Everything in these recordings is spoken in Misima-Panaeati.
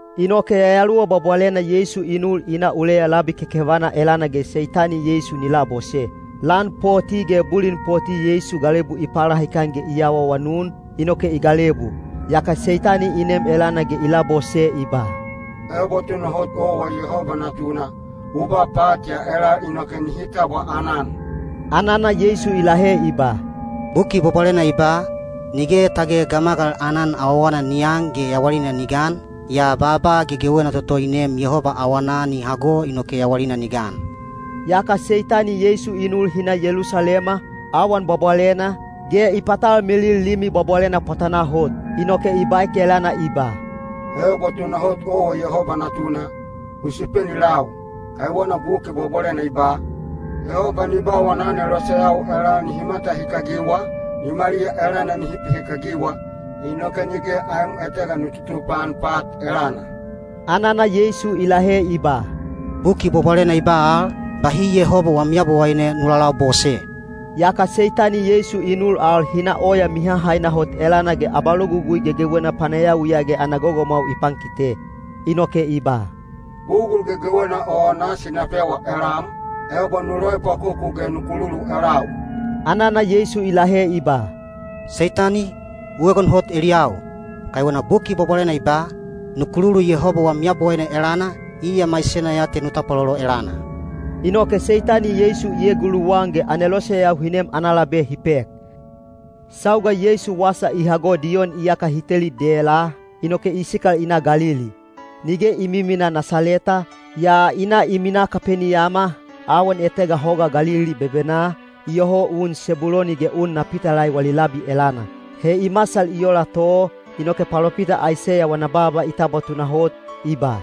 Inoke Yayaluwa Bwabwalena Yeisu i nul i na uleya labi kekevana elana ge Seitani Yeisu ni labose. Lan poti ge bulin poti Yeisu galebu i palahikan ge i awaawanun, inoke i galebu. Yaka Seitani i nem elana ge i labose i ba, “Ebo tunahot owa Yehoba Natuna, u ba pat ya elal inoke nihi tabwa aanan.” Anana Yeisu i lahe i ba, “Buki Bwabwalena i ba, ‘Nige tage gamagal aanan awawana ni an ge yawalina ni gan, yaa baaba gegewena toto i neem Yehoba awanaa ni hago inoke yawalina ni gan.’” Yaka Seitani Yeisu i nul hi na Yelusalema, awan bwabwalena, ge i patalmilil Limi Bwabwalena pwatanaa hot. Inoke i baek elana i ba, “Ebo tunahot owa Yehoba Natuna, u supeni lau, kaiwena Buki Bwabwalena i ba: Yehoba ni ba wana aneloseyau elal nihi matahikagiwa, nimaliya elana nihi pihikagiwa, inoke nige aem etega nu tutupaan pat elana.” Anana Yeisu i lahe i ba, “Buki Bwabwalena i ba al, ‘Bahi Yehoba wam Yabowaine nu lalabose.’” Yaka Seitani Yeisu i nul al hi na oya mihahaina hot elana ge abalogugui gegewena panayawiya ge ana gogomwau i pankite. Inoke i ba, “Bugul gegewena o nasi na pewa elam, ebo nu loepwakoku ge nu kululu elau.” Anana Yeisu i lahe i ba, “Seitani, u egon hot eliyau! Kaiwena Buki Bwabwalena i ba, ‘Nu kululu Yehoba wam Yabowaine elana, iya maisena ya te nu tapwalolo elana.’” Inoke Seitani Yeisu i eguluwan ge aneloseyau hi nem ana labe hi pek. Sauga Yeisu wasa i hago Diyon iyaka hi teli dela, inoke i sikal i na Galili. Nige i miminaa Nasaleta, yaa i na i minaa Kapeniyama, awan etega Hoga Galili bebenaa, iyoho un Sebuloni ge un Napitalai wali labi elana. He i masal i ola to, inoke palopita Aiseya wana baaba i tabwa tunahot, i ba: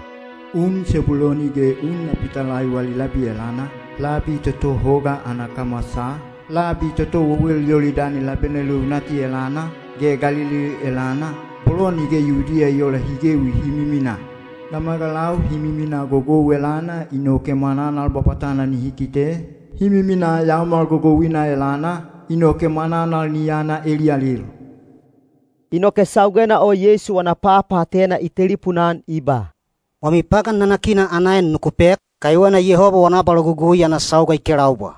Un Sebuloni ge un Napitalai wali labi elana, labi toto hoga ana kamwasaa, labi toto wewel Yolidani labena leunati elana, ge Galili elana, bolo nige Yudiya i oola hi gewi hi miminaa: gamagalau hi miminaa gogou elana inoke mwananal bwabwatana nihi kite, hi miminaa yaomal gogouina elana, inoke mwananal ni yana eliyalil. Inoke saugena o Yeisu wana papaatena i telipuna-an i ba, “Wami pagan nanakina ana en nuku pek, kaiwena Yehoba wana abalogugui ana sauga i kelaubwa.”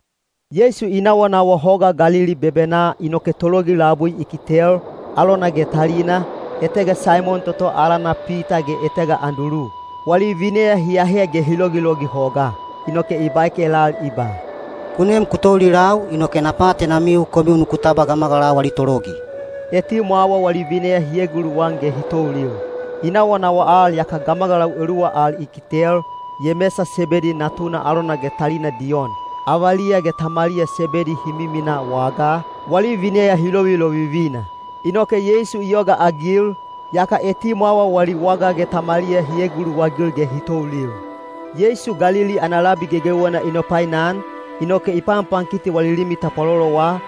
Yeisu i nawanawa Hoga Galili bebenaa inoke tologi labui i kitel, alona ge talina, etega Saimon toto alana Pita ge etega Andulu. Wali vineya hi ahe ge hi logilogi hogaa. Inoke i baek elal i ba, “Ku nem ku toulilau, inoke na paatenamiu komiu nuku tabwa gamagalau ali tologi.” Etimwawa wali vineya hi eguluwan ge hi toulil. I nawanawa al yaka gamagalau eluwa al i kitel, Yemesa Sebedi natuna alona ge talina Diyon. Avaliya ge tamaliya Sebedi hi miminaa wagaa, wali vineya hi lovilovivina. Inoke Yeisu i yogaagil, yaka etimwawa wali waga ge tamaliya hi eguluwagil ge hi toulil. Yeisu Galili ana labi gegewena i nopainan, inoke i panpankiti wali limi tapwalolowa,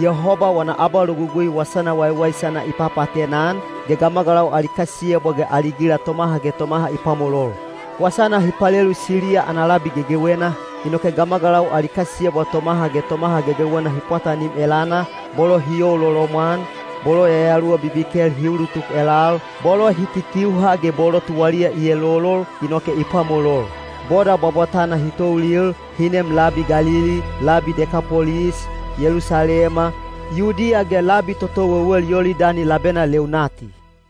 Yehoba wana abalogugui wasana waiwaisana i papaatena-an, ge gamagalau ali kasiyebwa ge ali gila tomaha ge tomaha i pwamolol. Wasana hi palelu Siliya ana labi gegewena, inoke gamagalau ali kasiyebwa tomaha ge tomaha gegewena hi pwatanim elana, bolo hi youlolomwan, bolo yayaluwa bibikel hi ulutuk elal, bolo hi kikiuha ge bolo tuwaliya i elolol, inoke i pwamolol. Boda bwabwatana hi toulil, hi neem labi Galili, labi Dekapolis, Yelusalema, Yudiya ge labi toto wewel Yolidani labena leunati.